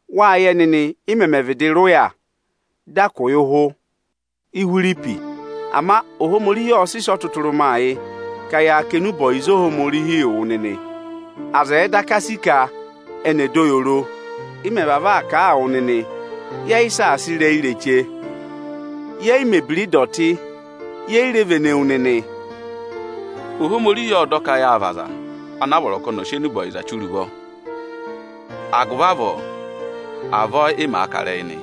Wáa yẹ nịnị, ị mẹmẹ vịdị rị ụya dị a kụ̀ yị ụhụ Íhwiripi. Ama Ohomorihi ọ sị sị ọtụtụrụma yị ka ya kà enube ọyịza anị yị wụ nịnị, aza ẹ̀ẹ daka sì ka ẹnị ẹ̀ dọ yị oro. Ị mẹ̀ vavọọ aa kà a wụ nịnị, yẹ yị saasa ịrẹyị ireche, yẹ yị mẹ̀ ebira ịdọtị, ye yi re vene wu nịnị. Ohomorihi ộ dọ ka yáa vị aza ana a vọrọ ka ọnị ọ̀ sị enube ọyịza chire ụvọ. Agụvị avọọ, avọọ ị màa kà ịrẹyị nị.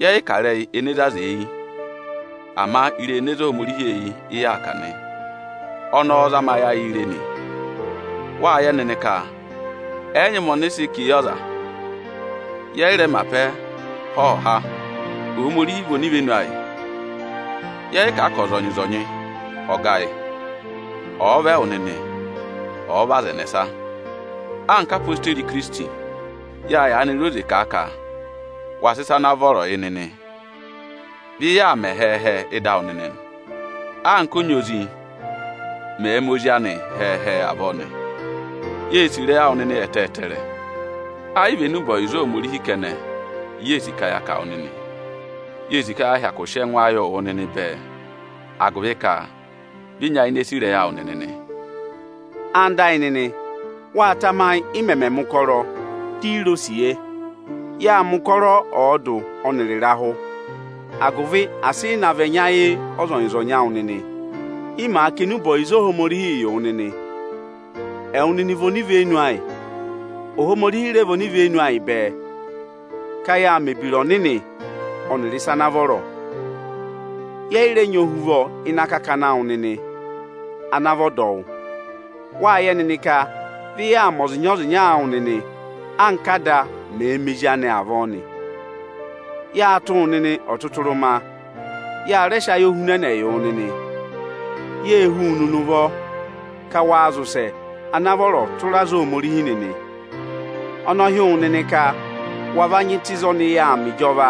Yẹ yị kà ịrẹyị ene zé aza eyi; ama ịrẹyị ene zé Ohomorihi eyi, ị yaa kà nị. Ọnị ọọ̄ zama ayị ayịị re nị. Wáa yẹ nịnị ka ẹ yị nyị ụmẹ ọnị ị sị kà eyi ọza; yẹ yị rẹ mẹ apẹ há ọhọha. Ohomorihi vị onivenu ayị. Yẹ yị kà ka ọzọnyị-ọzọnyị ọ̀ ga yị, ọ̀ọ vị ẹwụ nịnị, ọ̀ọ vị aza ẹnẹsa. Anka odeyi Ikirisiti, ya yaanị re oze kà a ka wa sị ịsa ana vọrọ yị nịnị. Vị yaa mẹ hẹẹ-hẹẹ ịdị awụ nịnị anka ọnyị ozi mẹ̀ẹ̄ mẹ ozi anị hẹẹ-hẹẹ avọọ nị. Yê sì ịrẹyị awụ nịnị ẹtẹẹtẹrẹ. Ẹ yị vị enube ọyịza Ohomorihi kẹnẹ i yee sì ka ya kà wụ nịnị; yee sì ka ya hyakụ sị ẹngụ ayịị wụ nịnị bẹẹ, agụvị ka vị ị nyayịnẹ sì ịrẹyị awụ nịnị nị. Ẹwụ nịnị ẹyịnyara amị, wáa tamayị, ị mẹmẹ mẹ̀ ụkọrọ, di i re osiye. Yáa mẹ̀ ụkọrọ ọọdụ ọnịrị ịrahụ, agụvị asị ị na vị ẹnya yị ọzọnyị-ọzọnyị awụ nịnị, ị màa kà enube ọyịza Ohomorihii yị wụ nịnị. Ẹwụ nịnị vị onivenu ayị, Ohomorihi rẹ vị onivenu bẹẹ, ka yáa mẹ̀ ebira ọnịnị ọnịrị ịsa ana vọrọ. Yẹ yị rẹ nyị ohuvọ ịnị akakana awụ nịnị ana vị ọdọwụ. Wáa yẹ nịnị ka vị yaa mẹ ọza ịnya ọza ịnya awụ nịnị anka ada mẹ̀ẹ̄ mẹ ezi anị avọọ nị. Yâ tụ́ wụ nịnị ọtụtụrụma; ya rẹ sị ayohunẹnẹ yị wụ nịnị. Yê hú wu nịnị ụvọ ka waa zị ụsẹ ana vọrọ tụra aza Ohomorihi nịnị. Ọnị ọ hị́ wụ nịnị ka wa va nyị tụ́ ịzị ọnị yà aa mẹ ịjọva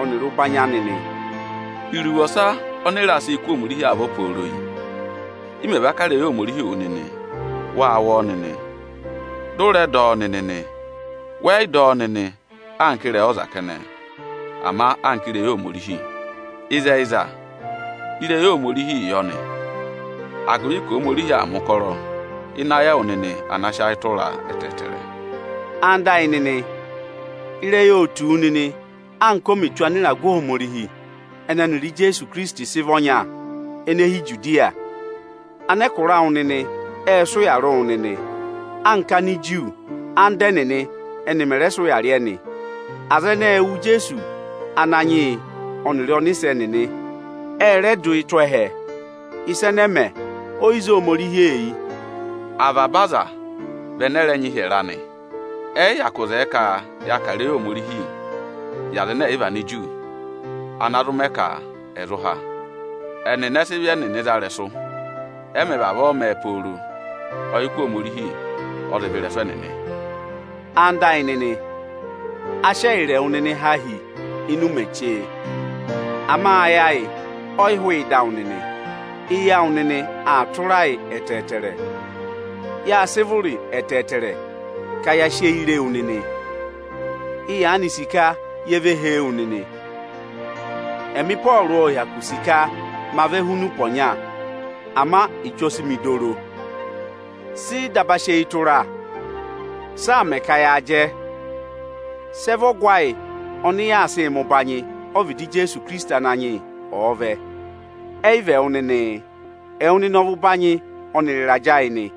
ọnịrị ụbanyị anị nị. Iruvo ọsa ọnị ị raa sịị kụ́ Ohomorihi avọ pooro yị: Ị mẹ̀ va kà ịrẹyị Ohomorihii wụ nịnị, wâ wụ́ ọọ nịnị, dị ụ rẹ dọ ọ nịnị nị. Wẹ yị dọ ọ nịnị anka ịrẹyị ọza kẹnẹ, ama anka ịrẹyị Ohomorihi. Ịzẹyịza, ịrẹyị Ohomorihi yọ nị, agụvị ka Ohomorihi aa mẹ̀ ụkọrọ ịnị ayị ẹwụ nịnị ana sị ayị tụraa ẹtẹẹtẹrẹ. Ẹwụ nịnị ẹyịnyara amị, ịrẹyị óo tù wu nịnị, anka o mè tù anịragụ Ohomorihi ọnị ọnịrị Ijeesu Ikirisiti sị vị ọnya, ene hi Ijudiya. Anẹkụra awụ nịnị ệ sị ụya rị wụ nịnị anka anda ẹnịnị Aniju ẹnị mẹ̀ rẹ sị ụya rị ẹnị. Aza ẹnẹẹ ệ wụ Ijeesu Ananyị yị ọnịrị ọnịsẹ ẹnịnị. Ệ rẹ dụ yị tụ́ ẹhẹ. Ịsa ẹnẹ mẹ, o yi zé Ohomorihi eyi. Avaba aza vị ẹnẹ ẹ rẹẹ̄ kụ̀ụ hịrẹ ẹtẹẹtẹrẹ. Ẹ yị hyakụ zẹẹ ka ya kà ịrẹyị Ohomorihi yị aza ẹnẹ ẹ yị vị Aniju, ana zụ mẹ ka ẹ̀ zụ há. Ẹnịnị ẹ sị ịvị za ịrẹsụ. Ẹ mẹ̀ vavọọ mẹẹ pooro, ọyịkụ Ohomorihi ọ zị vẹ ịrẹsụ ẹnịnị. Ẹwụ nịnị ẹyịnyara amị, a sị ẹyịrị ẹwụ nịnị há hi ịnị ụmẹ chee. Ama ayị ayị ọ yị yị hụụ ịdị awụ nịnị. Eyi awụ nịnị aa tụra ayị ẹtẹẹtẹrẹ. Yâ sị vụrị ẹtẹẹtẹrẹ ka ya sị eyi re wu nịnị. Ị yaanị sì ka ye ve hee wu nịnị. Ẹmị Ịpọọrụ ộ hyakụ sì ka ma vẹ huni ụpẹ ọnya, ama Echu ọ sị mị dọ oro. Sị ị daba sị eyi tụra? Sị aa mẹ ka yaa jẹ? Sị ẹ vị ọgụ ayị ọnị yaa sịị mẹ ụbanyị ọvịdị Ijeesu Ikirisiti Ananyị yị, ọ̀ọ vẹ? Ẹyị vị ẹwụ nịnịị? Ẹwụ nịnị ọ vị ụbanyị ọnịrị ịrajẹ ayị nị.